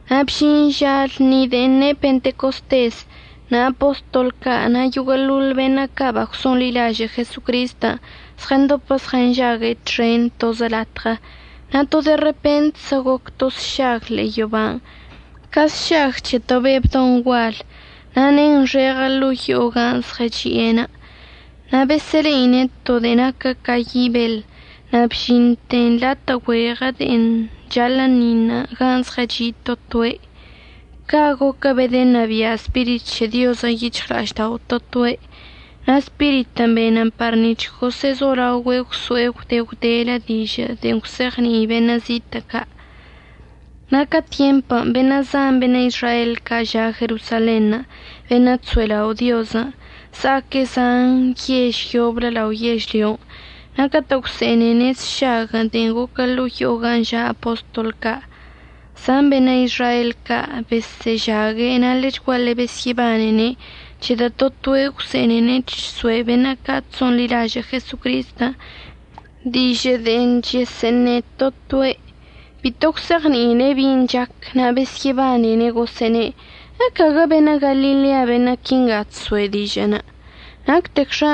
Na' bžin ža lṉi de'en ne' Pentecostes, na' apostol ca' na' yoguə'əḻoḻ beṉə' ca' bagwso'onḻilažə' Jesocristən' zɉəndopə zɉənžague' txen tozə latɉə. Na' to de repentzə goc to sšag ḻe'e yoban' ca sšag c̱he to be' bdon' gual na' nenxeɉə ḻo'o yo'o gan' zɉəchi'enə'. Na' besə'əle'ine' to de'en naquə ca yi' beḻ na' bžinte latə' güeɉə de'enə' chaḻə'əṉiṉ gan' zɉəchi' to toe'. Ca' goquə bedənabia' Spirit c̱he Diozən' yic̱hɉla'aždao' to toe', na' Spiritən' benən par nic̱h gosə'əzolaogüe' gwso'e gwde gwdelə dižə' de'e gwse'eɉni'i beṉə' zitə' ca'. Na' ca tyempən' beṉə' zan beṉə' Izrael ca' ža' Jerosalenṉə' beṉə' chso'elao' Diozən', za'aque' zan yež yoblə lao yežlyon'. Na' catə' gwse'enene' sšaguən' de'en goquə ḻo'o yo'o gan' ža' apostol ca', zan beṉə' Izrael ca' besə'əžague', na' ḻechguaḻe besyə'əbanene' c̱hedə' to toe' gwse'enene' chso'e beṉə' ca' chso'onḻilažə' Jesocristən' dižə' de'e chəsə'əṉe to toe'. Bito gwse'eɉni'ine' bin' chac na' besyə'əbanene', gosə'əne': ―¿Ecaguə beṉə' Galilea beṉə' quinga chso'e dižə'ənə'? ¿Nactecxa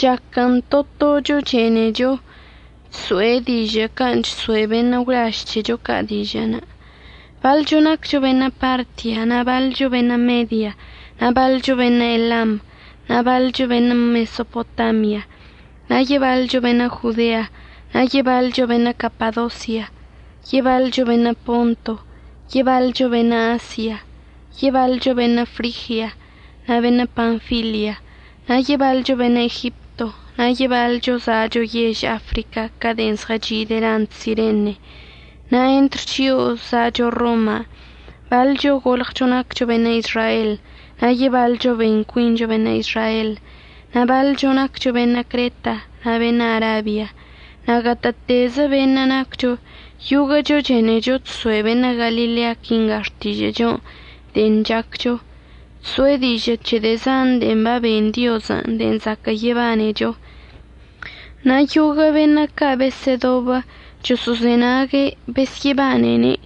chaquən' to tocho chenecho chso'e dižə' can' chso'e beṉə' gwlaž c̱hecho ca' dižə'? Baḻcho naccho beṉə' Partia na' baḻcho beṉə' Media, na' baḻcho beṉə' Elam, na' baḻcho beṉə' Mesopotamia. Na' yebaḻcho beṉə' Jodea, na' yebaḻcho beṉə' Capadosia, yebaḻcho beṉə' Ponto, yebaḻcho beṉə' Asia, yebaḻcho beṉə' Frigia na' beṉə' Panfilia, na' yebaḻcho beṉə' Egipto, na' yebaḻcho za'acho yež Africa ca' de'en zɉəchi' delant Sirene. Na' entr chio'o za'acho Roman' baḻcho golɉcho naccho beṉə' Izrael na' yebaḻcho ben cuincho beṉə' Izrael. Na' baḻcho naccho beṉə' Creta na' beṉə' Arabia. Na' gatə'ətezə beṉə' naccho, yoguə'əcho chenecho chso'e beṉə' Galilea quinga xtižə'əchon' de'en chaccho, chso'e dižə' c̱he de'e zan de'e baben Diozən' de'e zaquə' yebanecho. Na' yoguə' beṉə' ca' besə'ədobə choso'ozenague' besyə'əbanene'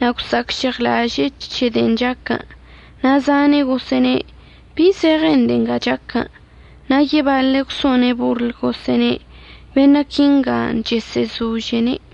na' gwsa'acžeɉlaže'e c̱he de'en chaquən', na' zane' gosə'əne': ―¿Bi zeɉen de'e nga chaquən? Na' yebaḻe' gwso'one' borl gosə'əne': ―Beṉə' quinga chesə'əzožene'.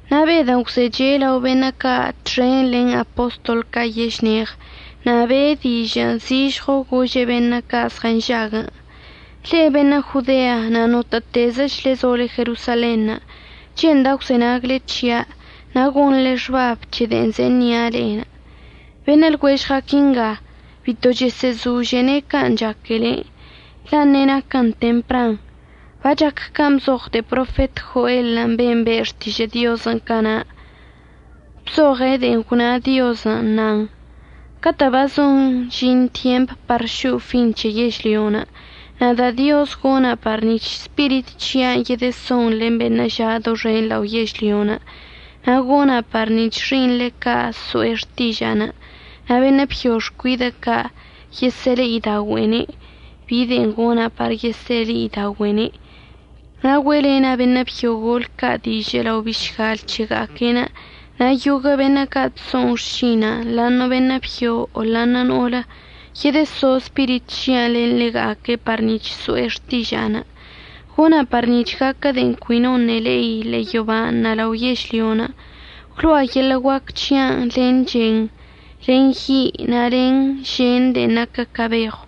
Na' Bedən' gwzeche' lao beṉə' ca' txen len apostol ca' yešneɉ na' be'e dižə'ən zižɉo gože' beṉə' ca' zɉənžaguən': ―Le'e beṉə' Jodea na' notə'ətezəchle zole Jerosalenṉə', che'enda' gwzenagle c̱hia' na' gonḻe xbab c̱he de'en ze'e ṉia' le'e. Beṉə' lɉuežɉa' quinga bito chəsə'əzožene' can' chaquele, la' ṉe'e naquə tempran. Bachac can' bzoɉ de'e profet Joelən' ben' be' xtižə' Diozən' cana', bzoɉe' de'en gwna Diozən', nan: Catə' bazon əžin tyemp par šo'o fin c̱he yežlyon' nada' Dioz gona' par nic̱h Spirit c̱hia'anə' yedəson len beṉə' ža' doxen lao yežlyon'. Na' gona' par nic̱h xi'iṉle ca' so'e xtiža'anə' na' beṉə' byo xcuidə' ca' yesə'əle'idaogüe'ene' bi de'en gona' par yesə'əle'idaogüe'ene', na' güe'elena' beṉə' byo golə ca' dižə' lao bišgal c̱hega'aque'enə'. Na' yoguə' beṉə' ca' chso'on xšina'anə' ḻa'aṉə' beṉə' byo o ḻa'aṉə' no'olə, yedəso Spirit c̱hia'anə' len ḻega'aque' par nic̱h so'e xtiža'anə'. Gona' par nic̱h gaquə de'en cui noṉə' le'i ḻe'e yoban' na' lao yežlyon'. Gwlo'a yeḻə' guac c̱hia'anə' len chen, len yi' na' len žen de'en naquə ca beɉw.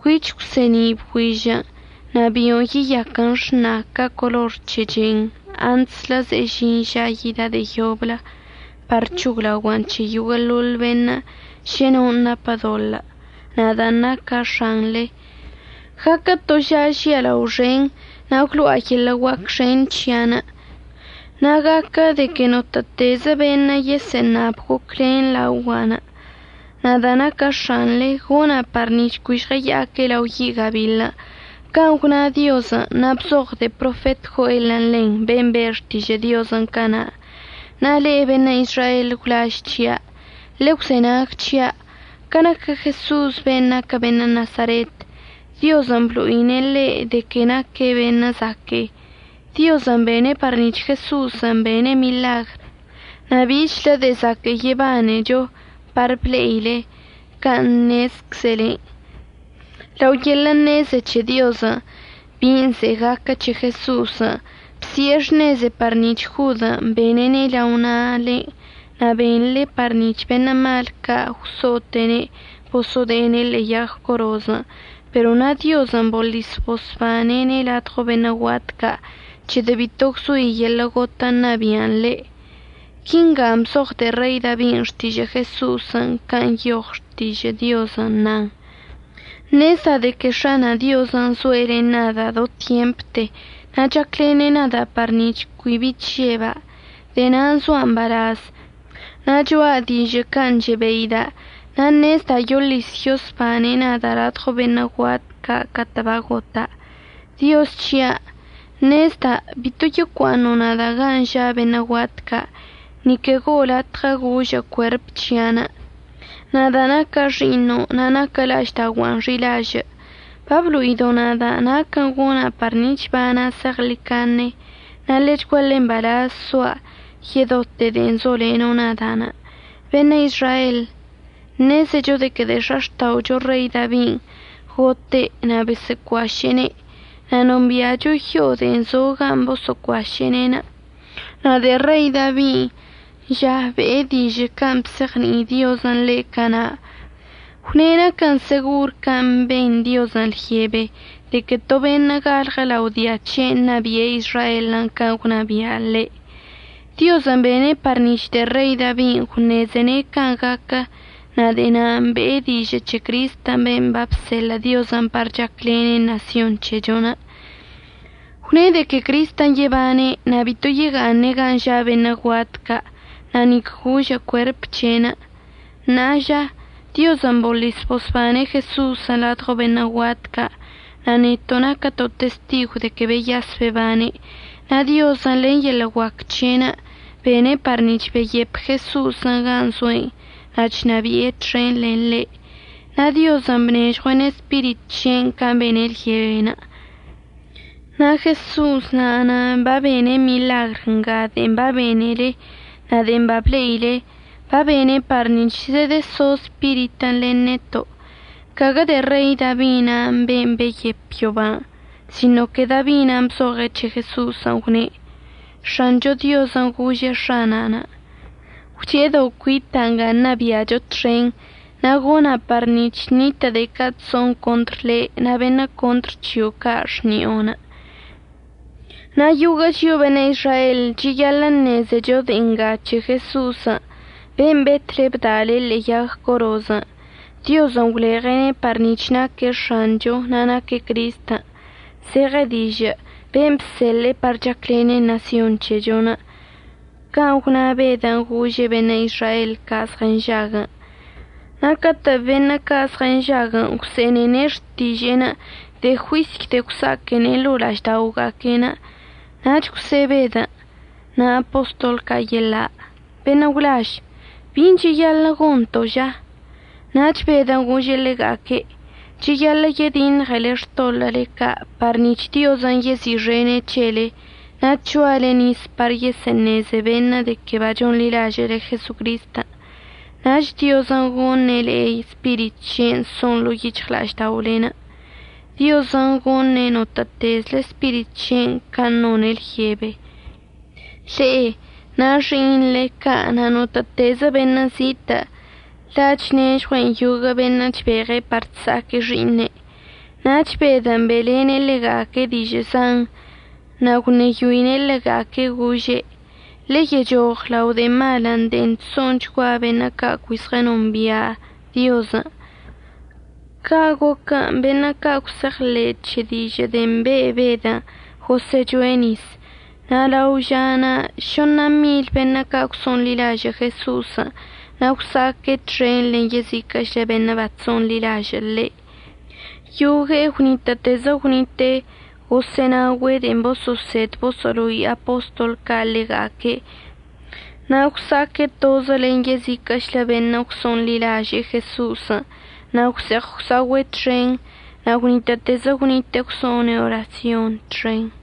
Cuich əgwse'eni' bgüižən', nach bio'onə' yeyaquən xṉa ca color c̱he chen antslə ze'e əžin ža yida' de'e yoblə par c̱hoglaogua'an c̱he yoguə'əḻoḻ beṉə' šə non' napə doḻə', nadan' naca' X̱anḻe. Gaquən to ža žialao xen, na' gwlo'a yeḻə' guac xen c̱hia'anə'. Na' gaquə de que notə'ətezə beṉə' yesə'əṉab goclen laogua', nada' naca' X̱anḻe gona' par nic̱h cui žɉəya'aque' lao yi' gabiḻ. Can' gwna Diozən' na' bzoɉ de'e profet Joelən' ḻen, ben' be' xtižə' Diozən' cana'. Na' le'e beṉə' Izrael gwlaž c̱hia', ḻegwzenag c̱hia'. Ca naquə Jeso'osən' ben' naquə beṉə' Nasaretən', Diozən' blo'ine' le'e de que naque' beṉə' zaque'e. Diozən' bene' par nic̱h Jeso'osən' bene' miḻagr na' bichlə de'e zaquə' yebanecho par ble'ile, can' ṉezczelenə'. Lao yeḻə' ṉeze c̱he Diozən' bin' ze'e gaquə c̱he Jeso'osən', bsi'e xṉeze par nic̱h Jodən' benene' lao na'alen' na' benḻe par nic̱h beṉə' mal ca' gwso'ote'ene' boso'ode'ene' ḻe'e yag corozən'. Pero na' Diozən' boḻis bosbane'ene' ladɉo beṉə' guat ca', c̱hedə' bito gwzoi yeḻə' gotən' ṉabia'an ḻe'. Quinga bzoɉ de'e Rei Dabin' xtižə' Jeso'osən' gan' nyoɉ Xtižə' Diozən' nan: Ṉezda' de que X̱ana' Diozən' zoe' len nada' do tyempte na' chaclene' nada' par nic̱h cui bi chžeba'. De'e na'anə' zoa' mbalaz na' cho'a dižə' can' chebeida' na' ṉezda' yoḻis yosbane' nada' ladɉo beṉə' guat ca' catə' bagota'. Dioz c̱hia' ṉezda' bito yocua'aṉo' nada' gan' ža' beṉə' guat ca', ni que go'o latɉə gožə' cuerp c̱hia'anə', nadan' naca' Xi'iṉon' na' naquə la'aždaogua'anə' xi'ilažə'. Bablo'ido' nada' naquən' gona' par nic̱h əbana' zeɉḻicaṉe na' ḻechguaḻe mbalaz soa' yedote de'en zoleno' nada'. Beṉə' Izrael, ṉezecho de que de'e x̱axta'ocho Rei Dabin' gote' na' boso'ocuaše'ene'. Na' nombi'acho yo'o de'en zo gan' boso'ocuaše'ene'. Na' de'e Rei Dabin' ža be'e dižə' can' bzeɉni'i Diozən' ḻe' cana'. Gwne' naquən segor can' ben Diozən' lyebe de que to beṉə' galɉə lao dia c̱he'enə' ṉabi'e Izraelən' can' gwnabia' ḻe'enə'. Diozən' bene' par nic̱h de'e Rei Dabin' gwṉezene' can' gaquə na' de'e na'anə' be'e dižə' c̱he Cristən' ben' babseḻə' Diozən' par chaclene' ṉasyon c̱hechon'. Gwne' de que Cristən' yebane' na' bito yega'aṉe' gan' ža' beṉə' guat ca' na' nic gožə' cuerp c̱he'enə'. Ṉa'a ža, Diozən' boḻis bosbane' Jeso'osən' ladɉo beṉə' guat ca' na' neto' naquəto' testigw de que beyas bebane'enə'. Na' Diozən' len yeḻə' guac c̱he'ene' bene' par nic̱h beyep Jeso'osən' gan' zoe'enə' na' chnabi'e txen len ḻe'. Na' Diozən' bnežɉue'ene' Spirit c̱he'enə' can' bene' lyebe. Na' Jeso'os na'anə' babene' miḻagr nga de'en babenele na' de'en bable'ile, babene' par nic̱h zedəso Spiritən' len neto'. Caguə de'e Rei Dabi na' ben' beyep yoban', sino de'e Dabin' bzoɉe' c̱he Jeso'osən' gwne': X̱ancho Diozən' gože' X̱ana'anə': “Gwche'edo' cuita' nga ṉabi'acho txen, na' gona' par nic̱h ṉitə' de'e ca' chso'on contr le' na' beṉə' contr c̱hio' ca' xni'onə'.” Na' yoguə' chio'o beṉə' Izrael cheyaḻə' ṉezecho de'en ngan' c̱he Jeso'osən' ben' betle bda'alene' ḻe'e yag corozən'. Diozən' gwleɉe'ene' par nic̱h naque' X̱anchon' na' naque' Cristən', zeɉe dižə' ben' bseḻe'e par chaclene' ṉasyon c̱hechon'. Can' gwna Bedən' gože' beṉə' Izrael ca' zɉənžaguən'. Na' catə' beṉə' ca' zɉənžaguən' gwse'enene' xtiže'enə' de'e juisy de'e gwsa'aquene' ḻo'o la'ažda'oga'aque'enə', nach gwse'e Bedən' na' apostol ca' yeḻa': ―Beṉə' gwlaž, ¿bin' cheyaḻə' gonto' ža? Nach Bedən' gože' ḻega'aque': ―Cheyaḻə' yediṉɉele xtoḻə'əle ca' par nic̱h Diozən' yezi'ixene' c̱hele na' c̱hoale nis par yesə'əṉeze beṉə' de que bachonḻilažə'əle Jesocristən'. Nach Diozən' goṉe' le'e Spirit c̱he'enə' son ḻo'o yic̱hɉla'ažda'olen'. Diozən' goṉe' notə'ətezle Spirit c̱he'enə' can' none' lyebe, le'e na' xi'iṉle ca' na' notə'ətezə beṉə' zitə', la' chnežɉue'en yoguə' beṉə' chbeɉe' par chsa'aque' xi'iṉe'. Nach Bedən' be'elene' ḻega'aque' dižə' zan, na' gwṉeyoine' ḻega'aque' gože': ―Ḻeyechoɉ lao de'e malən' de'en chso'onchgua beṉə' ca' cui zɉənombia' Diozən'. Ca' goquən' beṉə' ca' gwse'eɉḻe' c̱he dižə' de'en be' Bedən' gosə'əchoe' nis. Na' lao žanə' šoṉa mil beṉə' ca' gwso'onḻilaže'e Jeso'osən' na' gwsa'aque' txen len yeziquə'əchlə beṉə' bachso'onḻilažə'əcze' ḻe'. Yogue'e gwnitə'ətezə gwnite'e gosə'ənaogüe' de'en boso'osed boso'olo'i apostol ca' ḻega'aque' na' gwsa'aque' tozə len yeziquə'əchlə beṉə' gwso'onḻilažə' Jeso'osən' na' gwse'eɉ gwsa'ogüe' txen na' gwnitə'ətezə gwnite'e gwso'one' orasyonṉə' txen.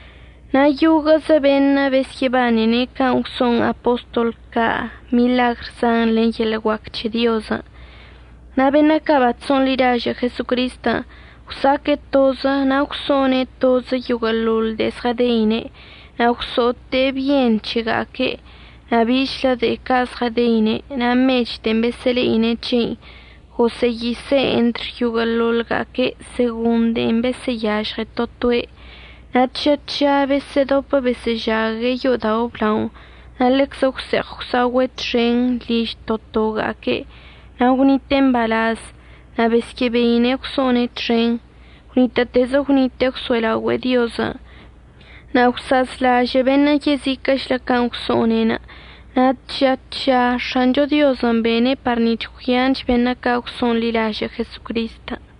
Na' yoguə'əzə beṉə' besyə'əbanene' can' gwso'on apostol ca' miḻagr zan len yeḻə' guac c̱he Diozən'. Na' beṉə' ca' bachso'onḻilažə' Jesocristən' gwsa'aque' tozə na' gwso'one' tozə yoguə'əḻoḻ de'en zɉədeine'. Na' gwso'ote'e byen c̱hega'aque'enə' na' bichlə de'e ca' zɉədeine' na' mech de'en besə'əle'ine' c̱hein' gosə'əyise'en entr yoguə'əḻoḻga'aque' segon de'en besə'əyažɉe to toe'. Na' tža tža besə'ədopə besə'əžague' yo'odao' əblaonə' na' ḻeczə gwse'eɉ gwsa'ogüe' txen liž to toga'aque' na' gwnite'e mbalaz na' besyə'əbeine' gwso'one' txen. Gwnitə'ətezə gwnite'e gwso'elaogüe'e Diozən'. Na' gwsa'azlažə' beṉə' yeziquə'əchlə can' gwso'one'enə'. Na' tža tža X̱ancho Diozən' bene' par nic̱h gwyanch beṉə' ca' gwso'onḻilažə' Jesocristən'.